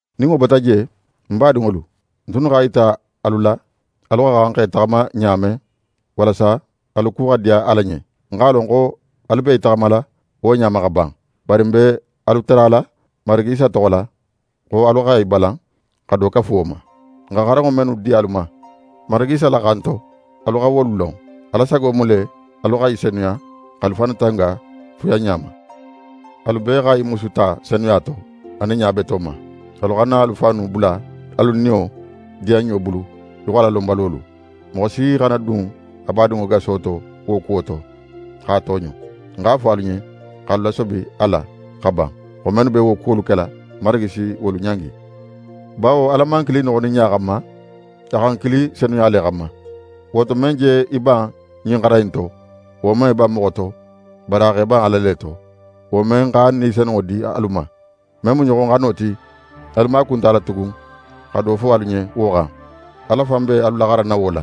Nin wo bota je, n badinŋolu, n tunnu x'a yita alu la, alu xa xan x'e taxama ɲa men, walasa alu ku xa diya Ala ɲen. N x'a lon xo alu be í taxamala wo ɲa ma xa ban. Bari n be alu tarala Marigi Isa toxo la, xo alu xa i balan xa do kafu wo ma. N xa xaranŋo mennu di alu ma Marigi Isa la xan to, alu xa wolu lon. Ala sago mu le, alu xa i senuya, x'alu fannu tanga fuyanɲa ma. Alu bee xa i musu ta senuya to, anin ɲa beto ma. Alu xana alu fannu bula alu niyo diyanɲo bulu í xo Alalonbalolu. Moxo si xana dun a badinŋo gaso to wo kuwo to, x'a tooɲo. N x'a fo alu ɲen, x'alu lasobi a la xa ban xo mennu be wo kuwolu kela, Marigi si wolu ɲangi. Bawo Ala man n kili noxoninɲa xanma; a xa n kili senuya le xanma. Wo to, men je í ban ɲin xaran in to, wo man í ban moxo to, bari a xa í ban Ala le to, wo men x'a Ni Senunŋo di alu ma. Men mu ɲoxoxano ti, alu maaku nte a la tugun xa do fo alu ɲen wo xan. Ala fan be alu laxaranna wo la.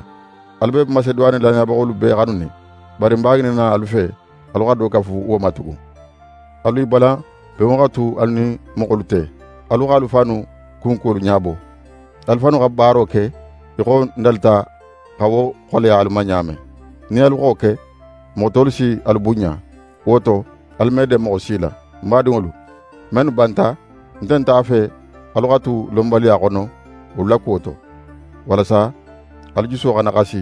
Alu be Maseduwane lannayabaxolu bee xanunin. Bari n b'a ŋininna alu fe, alu xa do kafu wo ma tugun. Alu i balan benŋo xa tu alu nin moxolu te, alu x'alu fannu kunkuwolu ɲabo, alu fannu xa baaro ke í xo n dalita xa wo xoleya alu ma ɲa men. Nin alu xa wo ke, moxo tolu si alu bunɲa. Wo to, alu me den moxo si la. N badinŋolu, mennu banta, n nte a fe alu xa tu lonbaliya xono wolu la kuwo to, walasa alu juso xana xasi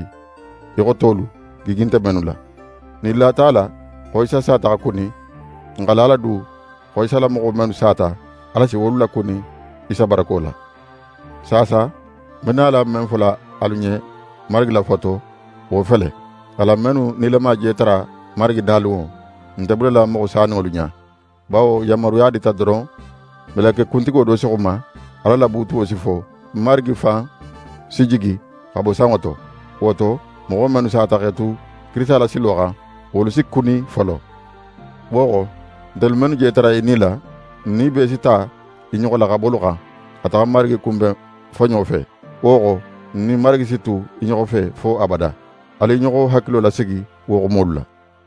í xo tolu, gigi nte mennu la. Nin n lata a la xo Isa sata xa kuni, n xa la a la du xo Isa la moxo mennu sata, Ala si wolu lakuni Isa barako la. Saasa, n be nala men fola alu ɲen Marigi la fo to, wo fele: Alan mennu nilama je tara Marigi nalunŋo, n nte bulala moxo saninŋolu ɲa. Bawo yanmaruya dita doron, meleke kuntigo do si xuma, Ala la buutuwo si fo, Marigi fan si jigi xa bo sanŋo to. Wo to, moxo mennu sata x'e tu Kirisita la silo xan, wolu si kuni folo. Wo xo, ntelu mennu je tara í nila, n nin i bee si ta i ɲoxo la xabolu xan, xa taxa Marigi kunben foɲo fe. Wo xo, n nin Marigi si tu i ɲoxo fe fo abada. Alu i ɲoxo hakilo lasigi wo xumolu la.